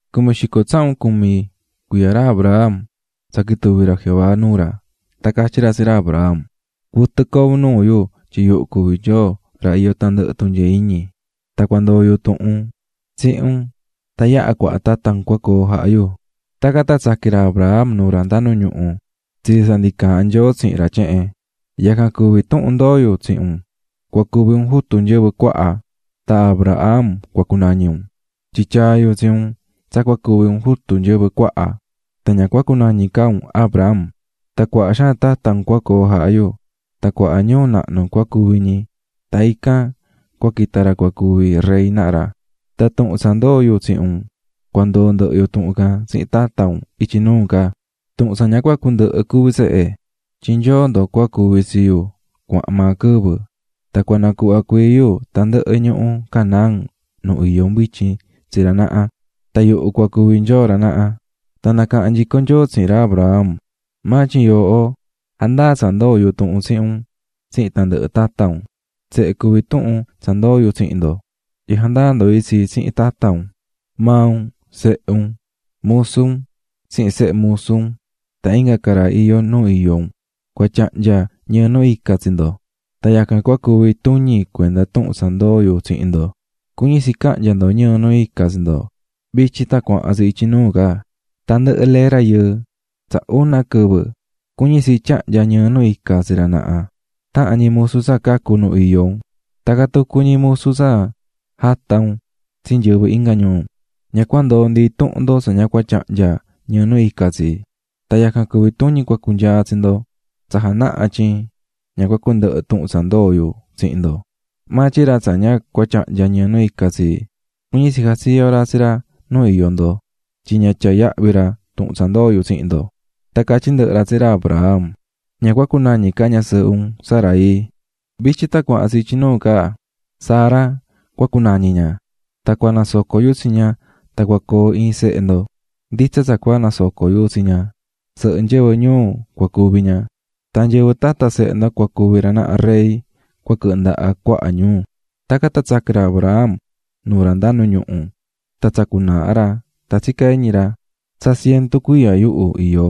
Cumi xico tsahun cumi cuiya ra Abram, tsa quituvi̱ ra Jehová nuu ra tan catyí ra tsihin ra: --Cuɨtɨ coo un nuu yu tyin yuhu cuví Nyoo ra iyó tandɨhɨ tunyee iñi. Tan cua ndoo yu tuhun tsihin un tan yaha cuaha tata un cua coo jaha yu. Tacan tan tsaqui̱n ra Abram nuu ra nda nu ñuhu, tsitsi tsa ndi caahán Nyoo tsihin ra tyehen: --Yacan cuví tuhun ndoó yu tsihin un: Cua cuvi un jutu nyɨvɨ cuaha. Tan Abraham cua cunañi un tyin tyaa̱ yu tsi un tsa cua cuvi un jutu nyɨvɨ cuaha, tan ña cua cunañi ca un Abram. Tan cuaha xaan tata un cua coo jaha yu, tan cuaha ñuu nahnu cua cuvi ñi tan ican cua quita ra cua cuvi rey naha ra. Tan tuhun tsa ndoó yu tsihin un cua ndoo ndɨhɨ yu tuhun can tsihin tata un ityi nuu ca, tuhun tsa ña cua cundɨhɨ cuví tsehe. Tyin Nyoo ndo cua cuvi tsi yu cuahan maa quɨvɨ. Tan cua nacuhva cuii yu tandɨhɨ ñuhu Canaán nu iyó un vityin tsi ra naha, tan yuhu cua cuvi Nyoo ra naha. Tan nacaha̱n nyico Nyoo tsihin ra Abraham: --Maa tyin yooho, ja̱ndaa tsa ndoo̱ yu tuhun tsihin un tsihin tandɨhɨ tata un. Tsehe cuví tuhun tsa ndoó yu tsihin ndo, tyin jandaa ndo itsi tan tsihin tata un, maa un, sehe un, musu un tsihin sehe musu un tan inga ca ra iyó nu iyó un cua tyahnya ñɨɨ nu ica tsi ndo. Tan yacan cua cuvi tuñi cuenda tuhun tsa ndoo̱ yu tsihin ndo, cuñí tsi cahnya ndo ñɨɨ nu ica tsi ndo. Vityin tan cuahan tsi ityi nuu, tandɨhɨ lee rayɨɨ tsa una quɨvɨ, cuñí tsi tyahnya ñɨɨ nu ica tsi ra naha, tahan ñi musu tsa cacú nu iyó un, tacan tucu ñi musu tsa jatá un tsi nyɨvɨ inga ñuu. Ña cua ndoo ndi intuhun ndo tsa ña cua tyahnya ñɨɨ nu ica tsi, tan yacan cuví tuñi cua cunyaa tsi ndo, tsa janahá tyin ña cua cundɨhɨ tuhun tsa ndoo̱ yu tsihin ndo. Maa tyin ra tsa ña cua tyahnya ñɨɨ nu ica tsi, cuñí tsi jatsiyo ra tsi ra nu iyó ndo, tyin ña tyaá yahvi ra tuhun tsa ndoo̱ yu tsihin ndo. Tan catyí ndɨhɨ ra tsihin ra Abraham: --Ña cua cunañi ca ñasɨɨhɨ un, Sarai, vityin tan ityi nuu Sara cua cunañi ña. Tan cua nasoco yu tsi ña, tan cua coo iin sehe ndo. Nditsa tsa cua nasoco yu tsi ña, sɨhɨ nyɨvɨ ñuu cua cuvi ña, tan nyɨvɨ tata sehe ndo cua cuvi ra naha rey cua quɨhɨ ndaha cuaha ñuu. Tacan tan tsaqui̱n ra Abraham nuu ra nda nu ñuhu, tan tsacú naaha ra tan tsicá iñi ra: "Tsa cientu cuiya yuhu iyó,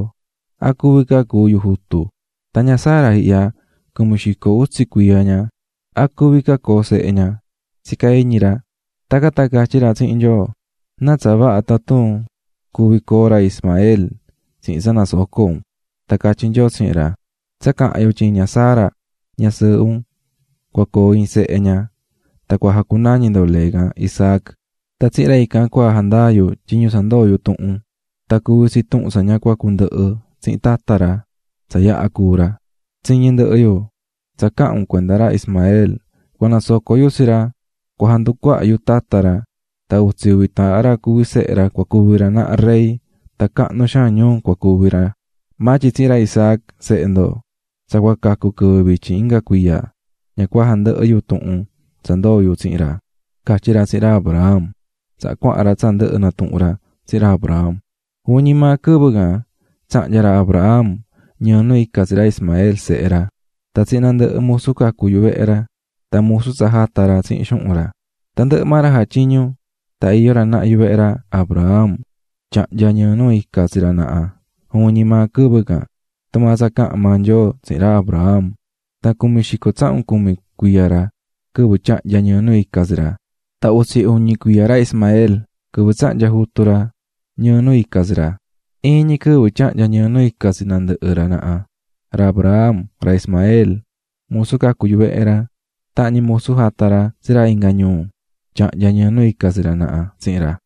¿a cuvi ca coo sehe yu tsihin ña Sara ñasɨɨhɨ yu? Tyin ña ihya tucu tsa iyó cumi xico utsi cuiya ña", cuñí ra, tsicá iñi ra. Tacan tan catyí ra tsihin Nyoo: --¡Náa tsa vaha tatun cuvi coo ra Ismael tsihin tsa nasocó un! Tan catyí Nyoo tsihin ra: --Tsa caha̱n yu tyin ña Sara, ñasɨɨhɨ un, cua coo iin sehe ña, tan cua jacunañi ndo lee can Isaac. Tan tsihin ra ican cua jandaa yu tyiñu tsa ndoo̱ yu tuhun, tan cuvi tsi tuhun tsa ña cua cundɨhɨ tsihin tata ra, tsa yaha cúu ra. Tsiñi̱ ndɨhɨ yu tsa caha̱n un cuenda ra Ismael, cua nasoco yu tsi ra, cua janducuaha yu tata ra, tan utsi uvi taahan ra cuvi sehe ra cua cuvi ra naha rey tan cahnu xaan ñuu cua cuvi ra. Maa tyin tsihin ra Isaac, sehe ndo tsa cua cacu quɨvɨ vityin inga cuiya, ña cua jandɨhɨ yu tuhun tsa ndoo̱ yu tsihin ra --catyí ra tsihin ra Abraham. Tacan tan cuahan ra tsa ndɨhɨ̱ natuhu̱n ra tsihin ra Abraham. Juvin ñi maa quɨvɨ can tsahnya̱ ra Abraham ñɨɨ nu ica tsi ra Ismael, sehe ra, tan tsihin nandɨhɨ musu cacu̱ yuvehe ra tan musu tsa jata̱ ra tsihin xuhun ra. Tandɨhɨ maa ra jatyiñú tan iyó ra naha yuvehe ra Abraham tyahnya̱ ñɨɨ nu ica tsi ra naha juvin ñi maa quɨvɨ can, tumaa tsa caha̱n maa Nyoo tsihin ra Abraham. Tan cumi xico tsahun cumi cuiya ra quɨvɨ tyahnya̱ ñɨɨ nu ica tsi ra. Tan utsi uñi cuiya ra Ismael, quɨvɨ tsahnya̱ jutu ra ñɨɨ nu ica tsi ra. Iin ñi quɨvɨ tyahnya̱ ñɨɨ nu ica tsi nandɨhɨ ra naha: Ra Abraham, ra Ismael, musu cacu̱ yuvehe ra, tahan ñi musu jata̱ ra tsi ra inga ñuu. Tyahnya̱ ñɨɨ nu ica tsi ra naha tsihin ra.